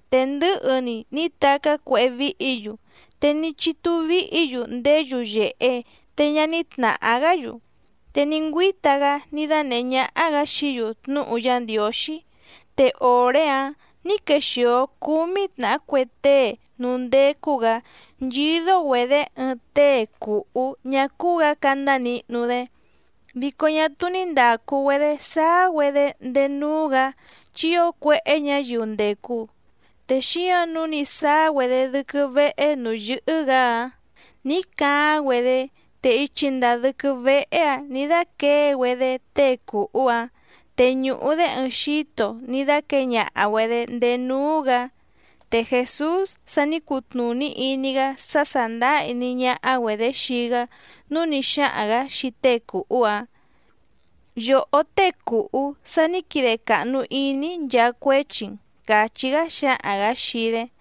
Te ndɨ̌hɨ‑ni ní tacá cuéhé víhǐ‑yu, te ní chítú víhǐ‑yu ndéé yuyèhe te ñá ní tnàhá‑gá‑yu. Te ní ngüíta‑gá ní dánèhé ñáhá‑gǎ xií‑yu tnúhu Yá Ndiǒxí. Te òré‑áⁿ nǐ quexìo cúmí tnàhá cue tée núú ndécú‑gǎ nchídó‑güedě ɨɨⁿ tée cùhú ñá cúú‑gǎ candá nihnu‑dé. Dico ñá túú ní ndàcu‑güedé sáá‑güedé ndéé núú‑gǎ chi ío cuéhé ñǎyiu ndècu. Te xíǎⁿ nǔu ní sáá‑güedé dɨ́quɨ́ véhé nǔú yɨ́hɨ́‑gǎ‑áⁿ nǐ caáⁿ‑güedé, te ichi ndàa dɨ́quɨ́ véhé‑ǎⁿ nǐ dáquěe‑güedé tée cùhú‑áⁿ, te ñùhu‑dé ɨɨⁿ xíto ní dáquěe ñaha‑güedě ndéé núú‑gǎ. Te Jèsús sa ní cutnùní iní‑gá sá sàndáá iní ñáhá‑güedě xii‑gá nǔu ní xáhaⁿ‑gǎ xii tée cùhú‑áⁿ: —Yòhó tée cùhú, sa ní quide càhnu iní‑í nchaa cuéchi‑n —càchí‑gá xǎhaⁿ‑gǎ xii‑dé.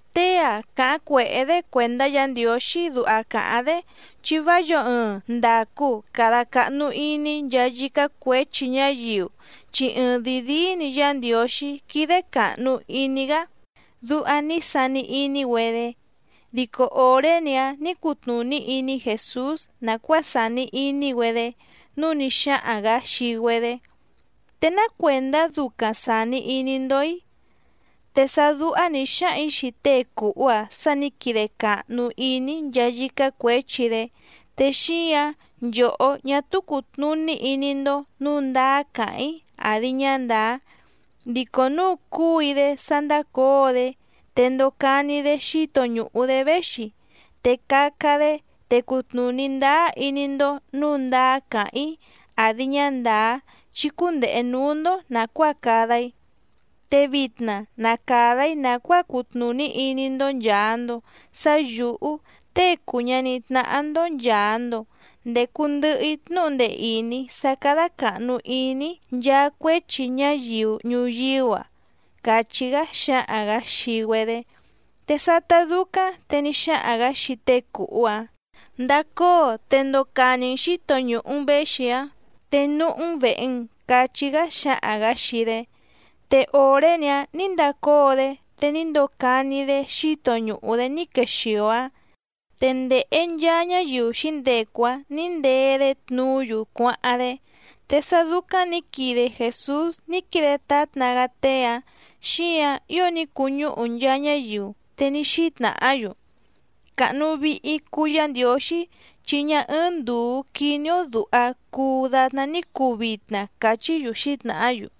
“Tée‑a càháⁿ cuèhé‑dé cuèndá Yǎ Ndiǒxí duha càháⁿ‑dé, chi vá yǒo ɨɨⁿ ndàcu cada cahnu iní nchaa yícá cuěchi ñáyiu chi ɨɨⁿdìi díí‑ni Yá Ndiǒxí quídé càhnu iní‑gá”, duha ní sani iní‑güedé. Dico òré‑ni‑áⁿ nǐ cutnùní iní Jèsús nàcuáa sàni iní‑güedé, núu ní xáhaⁿ‑gǎ xii‑güedé: —¿Te ná cuèndá ducaⁿ sàni iní‑ndó‑í? Te sá dúhá nǐ xáhaⁿ‑ǐ xii tée cùhú‑a sá nǐ quide càhnu iní‑í nchaa yícá cuěchi‑dé, te xíǎⁿ nchòhó ñá túú cùtnuní iní‑ndó nǔu ndáá càháⁿ‑í àdi ñá ndàá. Dico núu cúu‑í‑dé sá ndácǒo‑dé, te ndocani‑dé xíto ñùhu‑dé véxi, te caca‑dé, te cutnùní ndáá iní‑ndó nǔu ndáá càháⁿ‑í àdi ñá ndàá chi cundehe nǔú‑ndó nàcuáa cada‑í. Te vitna na càda‑í nàcuáa cutnùní iní‑ndó nchàa‑ndo sá yǔhú Tée cùu ñaní tnáhá‑ndó nchàa‑ndo ndecu ndɨhɨ‑í tnúhu ndee ìní sá cádá càhnu iní‑í nchaa cuéchi ñáyiu ñuyíú‑a —càchí‑gá xǎhaⁿ‑gǎ xii‑güedé. Te sátá dúcáⁿ te ní xáhaⁿ‑gǎ xii tée cùhú‑áⁿ: —Ndacóo te ndocani‑n xǐto ñùhu‑n véxi‑áⁿ, te núhú‑n vèhe‑n —cachí‑gá xǎhaⁿ‑gǎ xii‑dé. Te òré‑ni‑áⁿ nǐ ndacóo‑dé, te ní ndocani‑dé xíto ñùhu‑dé ní quexìo‑áⁿ, te ndèhe nchaa ñáyiu xǐndecu‑áⁿ nǐ ndee‑dé tnuú‑yu cuáháⁿ‑dé. Te sá dúcáⁿ nǐ quide Jèsús ní quide tátna‑gá tée‑áⁿ, xíǎⁿ ío ní cuñúhu nchaa ñáyiu, te ní xítnàhá‑yu: —Càhnu vihi cuu Yá Ndiǒxí, chi ñá ɨ́ɨ́ⁿ ndùu quiní‑ó dùha cuu datná ní cuu vitna —càchí‑yu xǐtnàhá‑yu.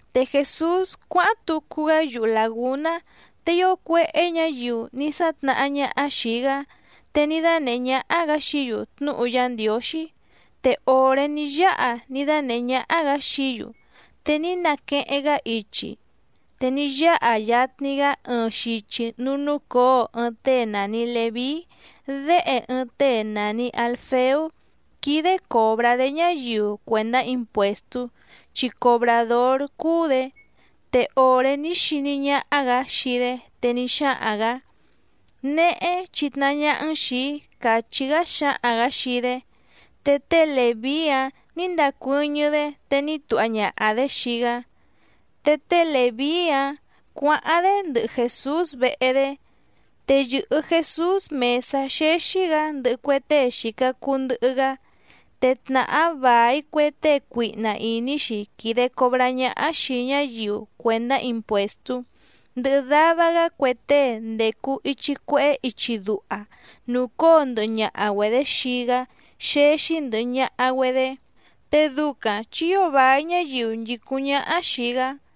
Te Jèsús cuáháⁿ tucu‑gá yuhu làgúná, te ío cuéhé ñǎyiu ní sátnàhá ñáhá xìi‑gá, te ní dánèhé ñáhá‑gǎ xií‑yu tnúhu Yá Ndiǒxí. Te òré ní yáha ní dánèhé ñáhá‑gǎ xií‑yu, te ní naqueheⁿ‑gá ichi, te ní yáha yatni‑gá ɨɨⁿ xichi núú núcǒo ɨɨⁿ tée nàni Leví déhe ɨɨⁿ tée nàni Alfeú quídé còbrá‑dé ñáyiu cuèndá impuèstú chi cobràdór cúú‑dě. Te òré ní xiní ñáhá‑gǎ xii‑dé, te ní xáhaⁿ‑gǎ: —Néhé chitnahá ñáhá‑n xìi‑í —càchí‑gá xǎhaⁿ‑gǎ xii‑dé. Te té Lèví‑áⁿ nǐ ndacuɨ́ñɨ́‑dé, te ní tuha ñaha‑dě xii‑gá. Te té Lèví‑áⁿ cuǎháⁿ‑dé ndɨhɨ Jèsús vehe‑dé. Te yɨ̀hɨ Jesús mèsá xéxí‑gǎ ndɨhɨ cue tée xìca cuu ndɨhɨ‑gá, te tnàhá vài cue tée cuihna ìní‑xi quìde cobrá ñáhá xìi ñáyiu cuèndá impuèstú, ndɨhɨ dava‑gá cue tée ndècu ichi cuehé ichi duha nùcóo ndɨhɨ ñaha‑güedě xii‑gá xéxí ndɨ̀hɨ ñaha‑güedé, te ducaⁿ chi ío vài ñáyiu nchìcúⁿ ñáhá xìi‑gá.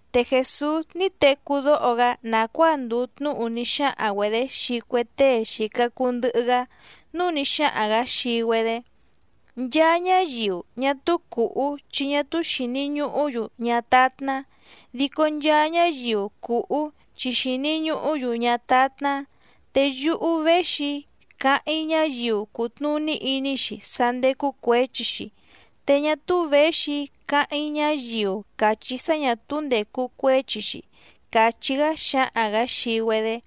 Te Jèsús ní tecú dóho‑gá nàcuáa ndùu tnúhu ní xáhaⁿ‑güedě xii cue tée xìca cuu ndɨhɨ‑gá, núu ní xáhaⁿ‑gǎ xii‑güedé: —Nchaa ñáyiu ñá túú cùhú chi ñá túú xìni ñuhú‑yu ñátátná, dico nchaa ñáyiu cùhú chi xìni ñuhú‑yu ñátátná. Te yúhú véxi‑í càháⁿ‑í ñáyiu cùtnuní iní‑xi sá ndécú cuěchi‑xi te ñá túú věxi‑í càháⁿ‑í ñáyiu càchí sá ñà túú ndècu cuéchi‑xi —càchí‑gá xǎhaⁿ‑gǎ xii‑güedé.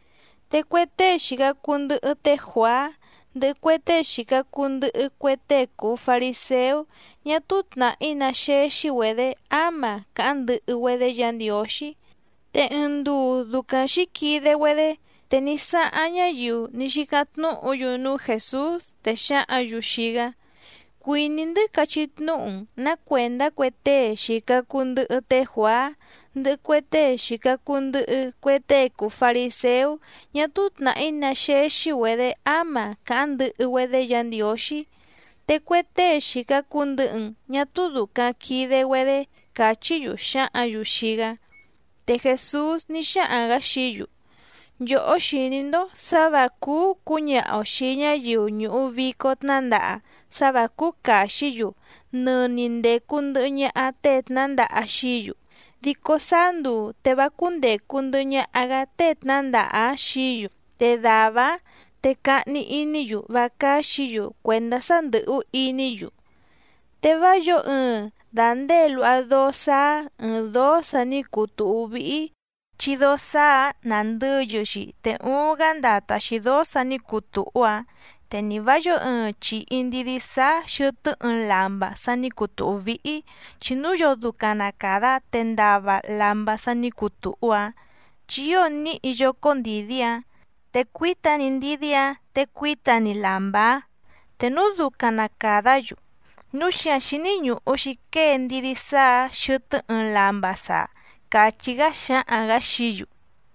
Te cue tée xìca cuu ndɨhɨ té Juàá, ndɨhɨ cue tée xìca cuu ndɨhɨ cue tée cùu fariséú ñá túú tnàhí ná xéxí‑güedě áma càháⁿ ndɨhɨ‑güedé Yǎ Ndiǒxí. Te ɨɨⁿ nduu ducaⁿ xǐquide‑güedé, te ní sáháⁿ ñáyiu ní xícáⁿ tnúhǔ‑yu núú Jèsús, te xǎhǎⁿ‑yu xii‑gá: —Cuìní‑ndɨ́ cachí tnúhu‑n nǎ cuèndá cue tée xìca cuu ndɨhɨ té Juàá, ndɨhɨ cue tée xìca cuu ndɨhɨ cue tée cùu fariséú ñá túú tnàhí ná xéxí‑güedě áma càháⁿ ndɨhɨ‑güedé Yǎ Ndiǒxí, te cue tée xìca cuu ndɨhɨ‑n ñá túú dùcaⁿ quide‑güedé —càchí‑yu xǎhǎⁿ‑yu xii‑gá. Te Jèsús ní xáhaⁿ‑gǎ xií‑yu: —Nchòhó xìní‑ndó sǎ vǎ cúú cǔñaha‑o xìi ñáyiu ñùhu vico tnándaha sá vǎ cúú càxí‑yu nɨni ndècu ndɨhɨ ñaha tée tnǎndaha xií‑yu. Dico sáá nduu te vá cúndècu ndɨhɨ ñaha‑gá tée tnǎndaha‑áⁿ xií‑yu, te dàvá‑áⁿ te cahni iní‑yu vá cáxǐ‑yu cuèndá sá ndɨ̀hú iní‑yu. ’Te vá yǒo ɨɨⁿ dàndée luha dóó sáá ɨ̀ɨⁿ dóó sa ní cuu tùhú víhí, chi dóó sáá‑ǎⁿ nàndɨyɨ‑xi te uuⁿ‑gá ndata‑xi dǒó sà ní cuu tùhú‑áⁿ. Te ni vǎ yǒo ɨɨⁿ chìhi ndidí sáá xɨ̀tɨ́ ɨɨⁿ lamba sa ní cuu tùhú víhí, chi núu yoo ducaⁿ na càda te ndava lamba sa ní cuu tùhú‑áⁿ, chi ío níhi yócó ndìdí‑áⁿ, te cuíta‑ni ndidí‑áⁿ te cuíta‑ni lamba‑áⁿ te núu ducaⁿ na càdá‑yu. Núu xíǎⁿ xíní ñùhu‑xi quée ndidí sáá‑ǎⁿ xɨtɨ́ ɨɨⁿ lamba saa —càchí‑gá xǎhaⁿ‑gǎ xií‑yu.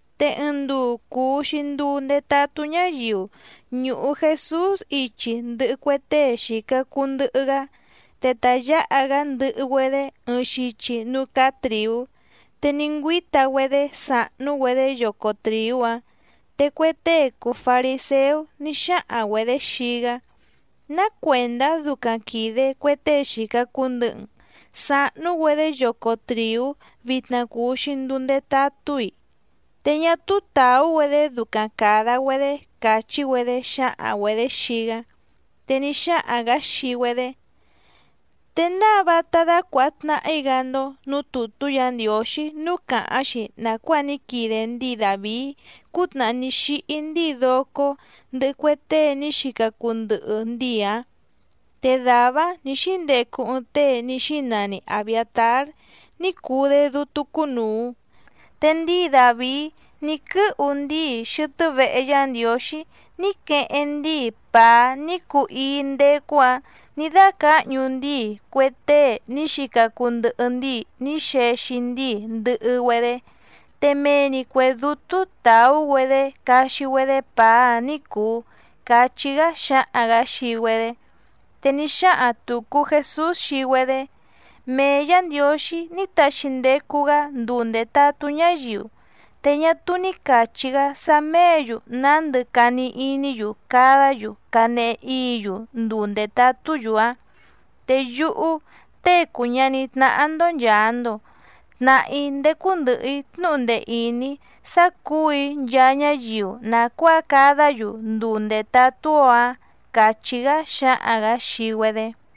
Te ɨɨⁿ nduu cùu‑xi nduu ndetatú ñáyiu ñùhu Jesús ichi ndɨhɨ cue tée xìca cuu ndɨhɨ‑gá, te ta yǎha‑gá ndɨhɨ‑güedé ɨɨⁿ xichi núú cáá trìú, te ní ngüíta‑güedé sàhnú‑güedé yoco trìú‑áⁿ. Te cue tée cùu fariséú ní xáhaⁿ‑güedě xii‑gá: —¿Ná cuèndá ducaⁿ quìde cue tée xìca cuu ndɨhɨ‑n sahnú‑güedé yoco trìú vitna cùu‑xi nduu ndetatú‑i? Te ñá túú tàú‑güedé ducaⁿ càda‑güedé —càchí‑güedé xǎhaⁿ‑güedě xii‑gá. Te ní xáhaⁿ‑gǎ xii‑güedé: —¿Te náa vátá dácuàha tnahi‑gá‑ndó nǔú tùtú Yǎ Ndiǒxí núú càháⁿ‑xi nàcuáa ní quide ndíi Dàvií cútnàhá ní xíhí ndíi docó ndɨhɨ cue tée ní xica cuu ndɨhɨ ndíi‑ǎⁿ? Te dàvá‑áⁿ nǐ xíndecu ɨɨⁿ tée ní xínani Abiàtár ní cuu‑dé dútú cúnùu, te ndíi Dàvií ní quɨ́hu ndíi xɨtɨ́ vehe Yá Ndiǒxí ní queheⁿ ndíi pàá ní cuu íí ndécú‑ǎⁿ nǐ dácǎhñu ndíi cue tée ní xica cuu ndɨhɨ ndíi ní xexi ndíi ndɨhɨ‑güedé, te mee‑ni cuè dútú tàú‑güedé caxi‑güedé pàá‑áⁿ ní cùu —cachí‑gá xǎhaⁿ‑gǎ xii‑güedé. Te ní xáhaⁿ tùcu Jesús xii‑güedé: —Mee Yǎ Ndiǒxí ní taxi ndecu‑gá nduu ndètatú ñáyiu, te ñá túú ní càchí‑gá sá méě‑yu nándɨ cani iní‑yu cadá‑yu canehe íǐ‑yu nduu ndètatú‑yu‑áⁿ. Te yúhú Tée cùu ñaní tnáhá‑ndó nchàa‑ndo, tnàhá‑í ndécú ndɨ̀hɨ‑í tnúhu ndee ìní sá cǔu‑í nchaa ñáyiu nàcuáa cadá‑yu nduu ndètatú‑ó‑áⁿ —càchí‑gá xǎhaⁿ‑gǎ xii‑güedé.